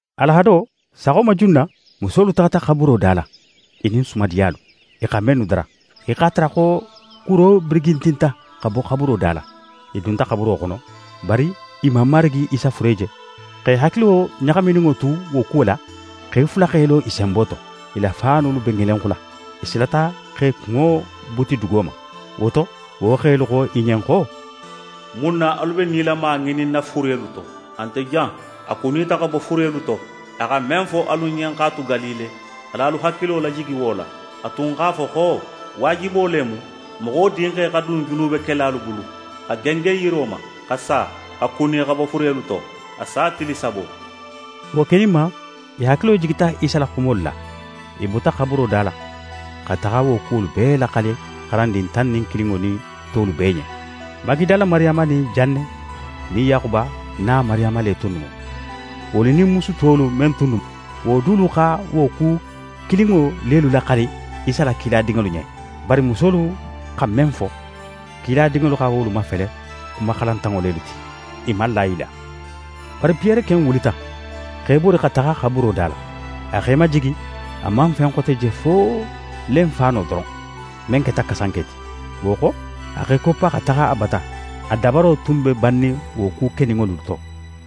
Alahado, saxo ma junna, musolu taxata xaburo da la, i nin sumadiyalu, i xa mennu dara. I x'a tara xo kuro birigintinta xa bo xaburo da la. I dunta xaburo xono, bari i man Marigi Isa fure je. X'e hakilo ɲaxamininŋo tu wo kuwo la, xe fula x'e lo i senbo to, i la faanolu be ŋelenxula. I silata x'e kunŋo buti dugo ma. Wo to, wo xelu xo i ɲen xo: «Mun na alu be nilama ŋininna furelu to? A nte jan, a kunita xa bo furelu to. A xa men fo alu ɲen x'a tu Galile, al'alu hakilo lajigi wo la. A tun x'a fo xo: “Waajibo le mu, Moxo Dinxe xa dun junubekelalu bulu, xa gengen yiro ma, xa sa, xa kuni xa bo furelu to, a sa tili sabo.”» Wo keninma, i hakilo jigita Isa la xumolu la. I bota xaburuda la, xa taxa wo kuwolu bee laxali xarandin tan nin kilinŋo nin tolu bee ɲen. Magidala Mariyama nin Janne nin Yaxuba na Mariyama le tunnu mu. Wolu nin musu tolu men tunnu mu, wo dulu xa wo ku kilinŋo lelu laxali Isa la kiladinŋolu ɲen. Bari musolu xa men fo, kiladinŋolu xa wolu mafele xuma xalantanŋo lelu ti. I man la i la. Bari Piyere ken wulita, x'é bori xa taxa xaburuda la. A x'é majigi, a man fen xote je fo lenfaano doron, men keta kasanke ti. Wo xo, a x'é koppa xa taxa a bata, a dabaro tun be bannin wo ku keninŋolu to.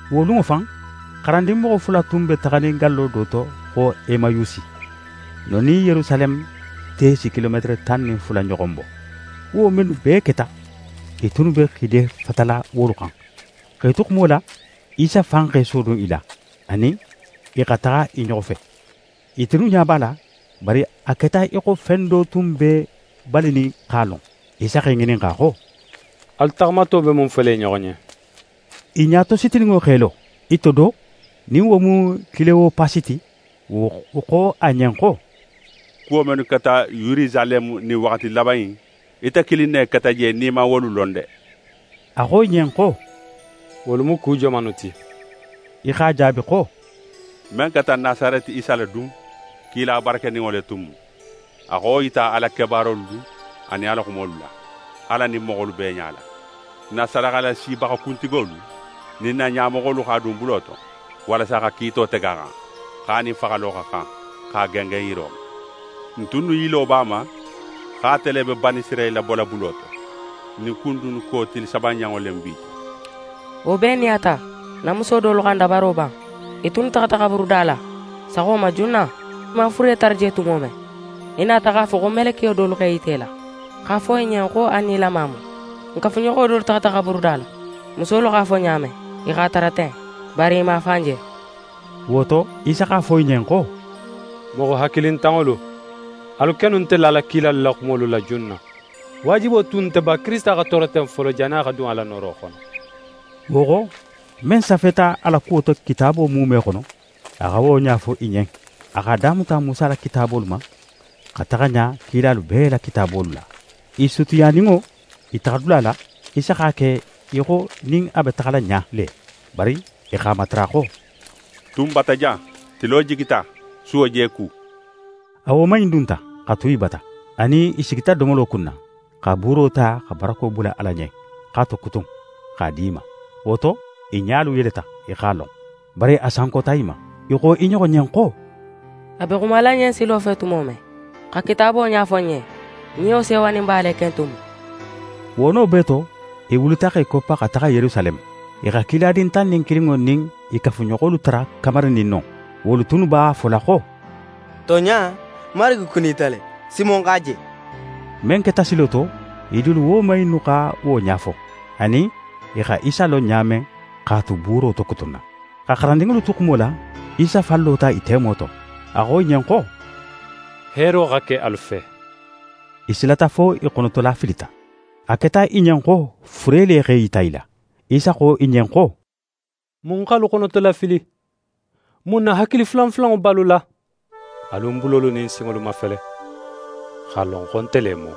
Wo lunŋo fan, xarandin moxo fula tun be taxanin gallo do to xo Emayusi. Non nin Yerusaleme te si kilometere tan nin fula ɲoxon bo. Kuwo mennu bee keta, i tunnu be xiidefatala wolu xan. X'e tu xumo la, Isa fan x'é sodun i la, a nin i xa taxa i ɲoxo fe. I tunnu ɲa b'a la, bari a keta í xo fen do tun b'e balinin x'a lon. Isa x'e ŋininxa xo: «Alu taxamato be mun fola i ɲoxo ɲen?» I ɲatositininŋo x'e lo. I to do, nin wo mu Kilewopasi ti, wo xo a ɲen xo: «Kuwo mennu keta Yerusaleme ɲin waxati laban in, ite kilin ne keta je nin í man wolu lon de?» A xo i ɲen xo: «Wolu mu ku jomannu ti?» I x'a jaabi xo: «Men keta Nasareti Isa la dun! Kila barakeninŋo le tun mu. A xa wo yita a la kebaarolu nin a la xumolu la, Ala nin moxolu bee ɲala. N na sadaxalasibaxa kuntigolu nin n na ɲamoxolu x'a dun bulo to, walasa xa kiito tege a xan, xo a nin faxalo xa xan, x'a gengen yiro ma. N tunnu yilo b'a ma xo ate le be Banisirayila bola bulo to. Ɲin ku in dunnu ko tili sabananŋo le mu bi ti. Wo bee nin a ta, n na muso dolu xa n dabaro ban. I tunnu taxata xaburuda la saxo ma junna. I man a fure tara je tumo men, i nata x'a fo xo melekiyo dolu x'e yita i la x'a fo i ɲen xo a nilama mu. N kafuɲoxo dolu taxata xaburuda la. Musolu x'a fo ɲa men, i x'a tara ten. Bari i man a fan je.» Wo to, Isa x'a fo i ɲen xo: «Moxo hakilintanŋolu, alu kennu nte lala kilalu la xumolu la junna. Waajibo tun nte ba, Kirisita xa tooro ten folo, jannin a xa dun a la nooro xono?» Wo xo, men safeta a la kuwo to Kitaabo muume xono, a xa wo ɲa fo i ɲen. A x'a damuta Musa la kitaabolu ma, xa taxa ɲa kilalu bee la kitaabolu la. I sutiyaninŋo i taxadula la, Isa x'a ke í xo nin a be taxala ɲa le. Bari i x'a matara xo: «Tu n bata jan! Tilo jigita, suwo je ku!» A woman in dunta, xa tu i bata. A nin i sigita domolo kunna, xa buuro ta xa barako bula Ala ɲen, x'a tokutun, x'a di i ma. Wo to, i ɲalu yeleta, i x'a lon. Bari a sankota i ma. I xo i ɲoxo ɲen xo: «A be xumala n ɲen silo fe tumo men, xa Kitaabo ɲafo n ɲen, n niyo sewoninba le ken tun mu.» Wo no bee to, i wulita x'e koppa xa taxa Yerusaleme. I xa kiladin tan nin kilinŋo nin i kafuɲoxolu tara kamarinin non. Wolu tunnu b'a fola xo: «Tonɲa, Marigi kunita le! Simon x'a je!» Men keta silo to, i dulu woman innu xa wo ɲa fo, anin i xa Isa lon ɲa men x'a tu buuro tokutunna. Xa xarandinŋolu tu xumo la, Isa fan lota i temo to. A xo i ɲen xo: «Heero xa ke alu fe.» I silata fo i xonotolafilita. A keta i ɲen xo fure le x'é yita i la. Isa xo i ɲen xo: «Mun x'alu xonotolafili? Mun na hakili fulanfulanŋo be alu la? Alu ń bulolu nin ń sinŋolu mafele, x'a lon xo nte le mu.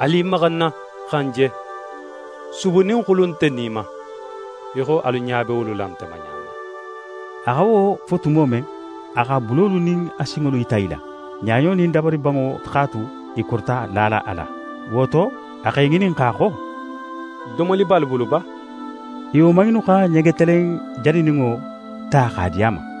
Alu i maxa ń na, xa ń je. Subu nin xulu nte ni ma, í xo alu ɲa be wolu la nte ma ɲa men.» A xa wo fo tumo men, a x'a bulolu nin a sinŋolu yita i la. Ɲaɲo nin dabaribanŋo x'a tu i korita lala a la. Wo to, a x'e ŋininxa xo: «Domoli be alu bulu ba?» I woman innu xa ɲegetelen janininŋo ta x'a di a ma.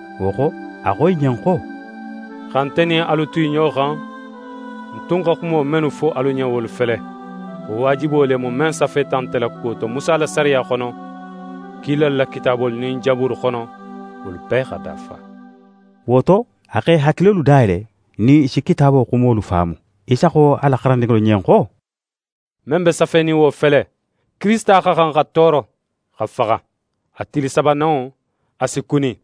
Wo xo, a xo i ɲen xo: «Xa nte nin alu tu i ɲoxo xan, ń tun xa xumo mennu fo alu ɲen, wolu fele: Xo waajibo le mu, men safeta nte la kuwo to Musa la sariya xono, kilalu la kitaabolu nin Jaburu xono, wolu bee xa dafa.» Wo to, a x'e hakilolu dayele, nin i si Kitaabo xumolu faamu. Isa xo a la xarandinŋolu ɲen xo: «Men be safenin, wo fele: Kirisita xa xan xa tooro, xa faxa. A tili sabananŋo, a si kuni,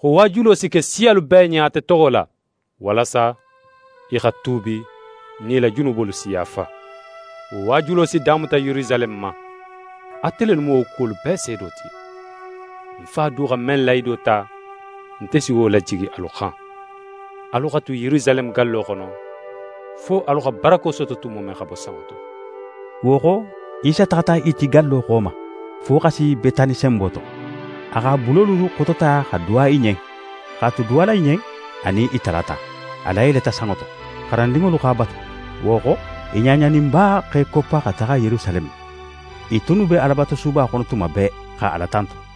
xo waajulo si ke siyalu bee ɲen ate toxo la, walasa i xa tuubi nin i la junubolu si yaafa. Wo waajulo si damuta Yerusaleme ma. Ate lelu mu wo kuwolu bee seedo ti. Ń Fa du xa men lahido ta, nte si wo lajigi alu xan. Alu xa tu Yerusaleme gallo xono, fo alu xa barako soto tumo men xa bo sanŋo to.» Wo xo, Isa taxata i ti gallo xo ma, fo xa si Betani senbo to. A x'a bulolu xotota xa duwa i ɲen. X'a tu duwala i ɲen, a nin i talata. A layeleta sanŋo to. Xarandinŋolu x'a batu. Wo xo, i ɲaɲaninba x'e koppa xa taxa Yerusaleme. I tunnu be Alabatusuba xono tuma bee, xa Ala tantu.